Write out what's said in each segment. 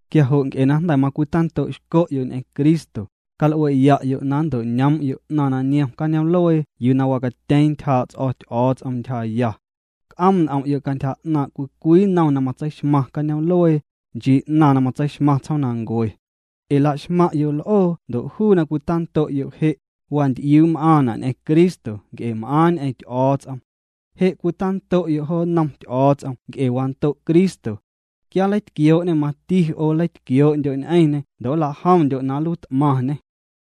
Quia jo' nc'e na jnda̱ macwitando'xco'yo' ñ'eⁿ Cristo, cal'ue'ya'yo' na nnto'ñoom'yo' 'naⁿ na niom cañoom'luee yuu na wacatyeeⁿ ntyjaa' ts'o̱ Ty'o̱o̱ts'om ntyjaya. C'oom' n'om'yo' cantyja 'naaⁿ cwii cwii nnom na matseixmaⁿ cañoom'luee, nchii 'naⁿ na matseixmaⁿ tsjoomnancue. Ee laxmaⁿ'yo' l'oo ndo' juu na cwita'ndo'yo' je', wanty'iuu' m'aaⁿna' ñ'eⁿ Cristo nc'e m'aaⁿ ñ'eⁿ Ty'o̱o̱ts'om. Je' cwitando'yo' jo nnom Ty'o̱o̱ts'om nc'e wando' Cristo. Quia nleitquioo'nê, mati 'o nleitquioo'ndyo' ñ'eⁿñê ndo' nlajomndyo' na nluiit'maⁿñê.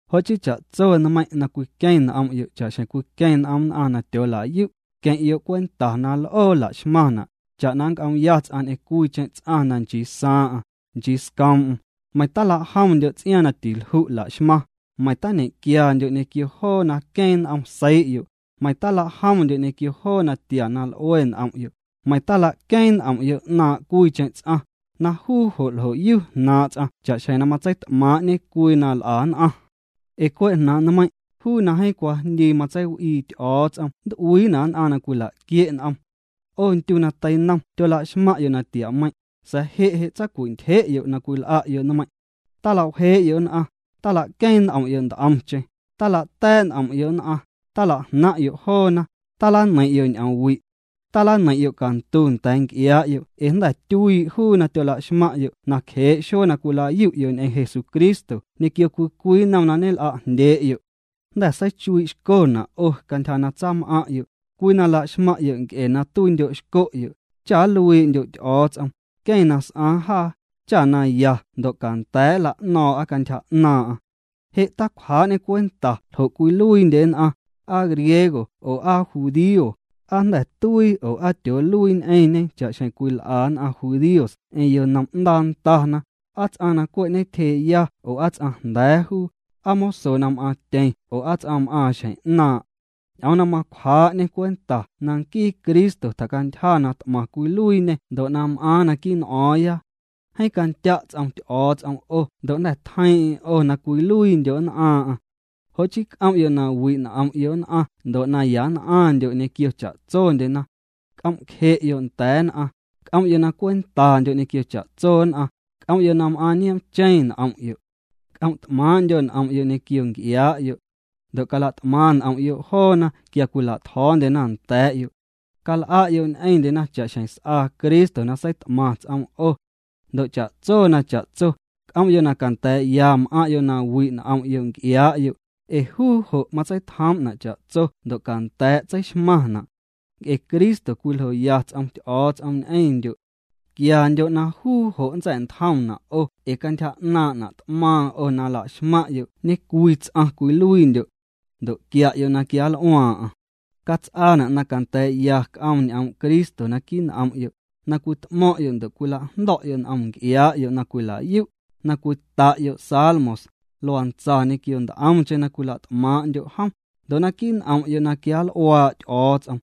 Jo' chii cha'tso nmeiⁿ' na cwiqueⁿ n'om'yo' cha'xjeⁿ cwiqueⁿ n'om nn'aⁿ na tyoolayu', queⁿ'yo' cwenta na l'oo laxmaⁿna', cha'na na nc'oomya ts'aⁿ ñ'eⁿ cwiicheⁿ ts'aⁿ na nchii saaⁿ'aⁿ, nchii scoom'm, meiⁿ talajomndyo' ts'iaaⁿ na tilju' laxmaⁿ, meiⁿ tañequiandyo' ñequio joo na queeⁿ n'om seii'yo', meiⁿ tala'jomndyo' ñequio joo natia na l'ue n'om'yo', meiⁿ tila'queeⁿ n'om'yo' 'naaⁿ' cwiicheⁿ ts'aⁿ, na juu jo' ljo'yu jnaaⁿ' ts'aⁿ cha'xjeⁿ na matseit'maaⁿ'ñe cwii na nl'a nn'aⁿ. Ee cwe' jnaaⁿ' nmeiⁿ', juu na jeeⁿ cwajndii matseiw'ii Ty'o̱o̱ts'om nnt'uiina' nn'aⁿ na cwilaquie' n'omna. 'O ndyu na teinom tyolaxmaⁿ'yo' natiameiⁿ', sa̱a̱ je' je' tsacwintyje'yo' na cwil'a'yo' nmeiⁿ'. Talawjee'yo' nn'aⁿ, talaqueeⁿ n'om'yo' nt'omcheⁿ, talata̱a̱' n'om'yo' nn'aⁿ, tala'jnaⁿ'yo' joona, talaneiⁿ'yo' ñ'oomwi'. Talaneiⁿ'yo' cantu nda̱a̱ nc'iaa'yo' ee jnda̱ tyuii' juu na tyolaxmaⁿ'yo' na cjee' xuee na cwila'yu'yo' ñ'eⁿ Jesucristo ñequio cwii cwii nnom na ñel'ajndyee'yo'. Jnda̱ seichuii'xco'na' o' cantyja na tsam'aⁿ'yo', cwii na laxmaⁿ'yo' nc'e na tuiindyo'xco'yo', cha nluii'ndyo̱ Ty'o̱o̱ts'om, nqueⁿ na s'aaⁿ jaa, cha na ya ndo' canda̱a̱' nla'no̱o̱ⁿ'a cantyja 'naaⁿ'aⁿ. Je' ticwjaa'ñê cwenta ljo' cwiluiindye nn'aⁿ, aa griego oo aa judío, aa jnda̱ tuii oo aa tyooluii ñ'eⁿñe cha'xjeⁿ cwil'a nn'aⁿ judíos ñ'eⁿ yonom'ndaa ndana, aa ts'aⁿ na cwe' ñetyjee'ya oo ts'aⁿjnda̱a̱ juu, aa moso na m'aaⁿtyeⁿ oo aa ts'aⁿ m'aaⁿ xjeⁿ 'naaⁿ'. Ñ'oom na macwjaa'ñê cwenta na nquii Cristo tjacantyja na t'maⁿ cwiluiiñê ndo' na m'aaⁿ naquii' n'o̱o̱ⁿya. Jeeⁿ candya' ts'om Ty'o̱o̱ts'om 'o ndo' jnda̱ tjeiiⁿ'eⁿ 'o na cwiluiindyo' nn'aaⁿ'aⁿ. Jo' chii c'om'yo' na wi' n'om'yo' nn'aⁿ ndo' na ya nn'aⁿndyo' ñequio cha'tsondyena. C'om'cje'yo' nda̱a̱ nn'aⁿ, c'om'yo' na cwentandyo' ñequio cha'tso nn'aⁿ, c'om'yo' na m'aaⁿ nioomcheⁿ n'om'yo'. C'om't'maaⁿ'ndyo' n'om'yo' ñequio nc'iaa'yo'. Ndo' cala't'maⁿ n'om'yo' joona quia cwila'tjo̱o̱ndyena nda̱a̱'yo'. Cal'a'yo' ñ'eⁿndyena cha'xjeⁿ s'aa Cristo na seit'maⁿ ts'oom 'o. Ndo' cha'tso na cha'tso, c'om'yo' na canda̱a̱'ya m'aⁿ'yo' na wi' n'om'yo' nc'iaa'yo', ee juu jo' matseitjoom'na' cha'tso ndo' canda̱a̱' tseixmaⁿna'. Nc'e Cristo cwiljoya ts'om Ty'o̱o̱ts'om ñ'eⁿndyo'. Quiandyo' na juu jo' nntsa̱'ntjomna' 'o ee cantyja 'naaⁿ'na' t'maaⁿ 'o na nlaxmaⁿ'yo' ñecwii ts'aⁿ cwiluiindyo'. Ndo' quia'yo' na quianl'uaaⁿ'aⁿ. Cats'aana' na canda̱a̱'ya c'oom ñ'oom' Cristo naquii' n'om'yo', na cwit'mo̱ⁿ'yo' ndo' cwilajndo̱'yo' n'om nc'iaa'yo' na cwila'yu', na cwita'yo' salmos, luantsa ñequio nt'omcheⁿ na cwila't'maaⁿ'ndyo' jom, ndo' naquii' n'om'yo' na quianl'uaa' Ty'o̱o̱ts'om.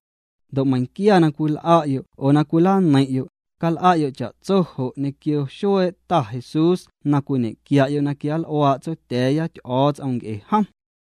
Ndo' meiⁿnquia na cwil'a'yo' oo na cwilaneiⁿ'yo', cal'a'yo' cha'tso jo' ñequio xuee' Ta Jesús na cwiñequia'yo' na quianl'uaa' Tsotya̱a̱ya Ty'o̱o̱ts'om nc'e jom.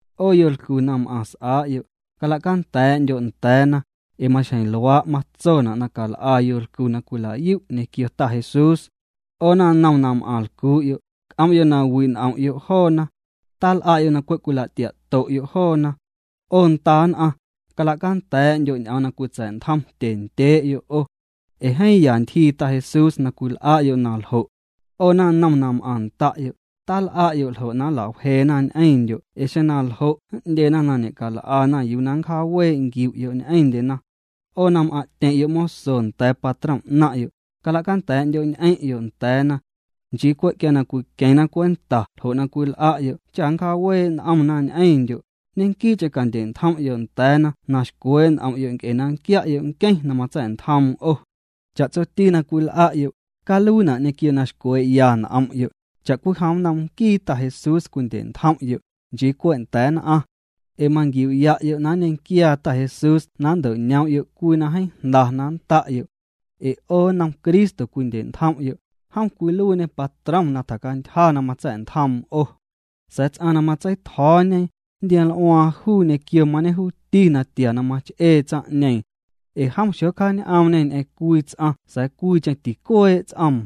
'O yolcu na m'aⁿ s'aa'yo', cala'canda̱a̱'ndyo' nda̱a̱na, ee maxjeⁿ luaa' matsona' na cal'a yolcu na cwila'yu' ñequio Ta Jesús. 'O naⁿnom na m'aⁿ lcuu'yo', c'om'yo' na wi' n'om'yo' joona. Tal'a'yo' na cwe' cwila'tia'to'yo' joona. 'O nda nn'aⁿ, cala'canda̱a̱'ndyo' ñ'oom na cwitsa̱'ntjom tyendyee'yo' 'o. Ee jeeⁿ ya ntyjii Ta Jesús na cwil'a'yo' na ljo'. 'O naⁿnom na m'aⁿ nda'yo', tal'a'yo' ljo' na nlawjeena ñ'eⁿndyo' ee xeⁿ naljo' n'ndyena na ñe'cal'ana yuu na ncjaawee' nquiu'yo' ñ'eⁿndyena. 'O na m'aⁿ'tyeⁿ'yo' moso nda̱a̱ patrom 'naⁿ'yo', cala'canda̱a̱'ndyo'ñ'eⁿ'yo' nda̱a̱na. Nchii cwe' quia na cwiqueⁿna cwenta ljo' na cwil'a'yo' cha nnjaawee' n'omna ñ'eⁿndyo', ñequii'cheⁿ candye'ntjom'yo' nda̱a̱na na xcwee' n'om'yo' nc'e na nquia'yo' Nqueⁿ na matsa̱'ntjoom 'o. Cha'tsoti na cwil'a'yo', caluiina' ñequio na xcwee'ya n'om'yo', cha'cwijom nnom nquii Ta Jesús cwindye'ntjom'yo', nchii cwe' nda̱a̱ nn'aⁿ. Ee manquiu'ya'yo' na nñequiaa Ta Jesús na nnto'ñoom'yo' cwii na jeeⁿ jnda na nnda'yo'. Ee 'o nnom Cristo cwindye'ntjom'yo', jom cwiluiiñê patrom na tjacantyja na matsa̱'ntjoom 'o. Sa̱a̱ ts'aⁿ na matsei'tjo̱o̱ñe, nntioml'uaaⁿ juu ñequio mañejuuti natia na mach'ee tsaⁿ'ñeeⁿ. Ee jom xocjaañ'oomñê ñ'eⁿ cwii ts'aⁿ sa̱a̱ cwiicheⁿ ticuee' ts'oom.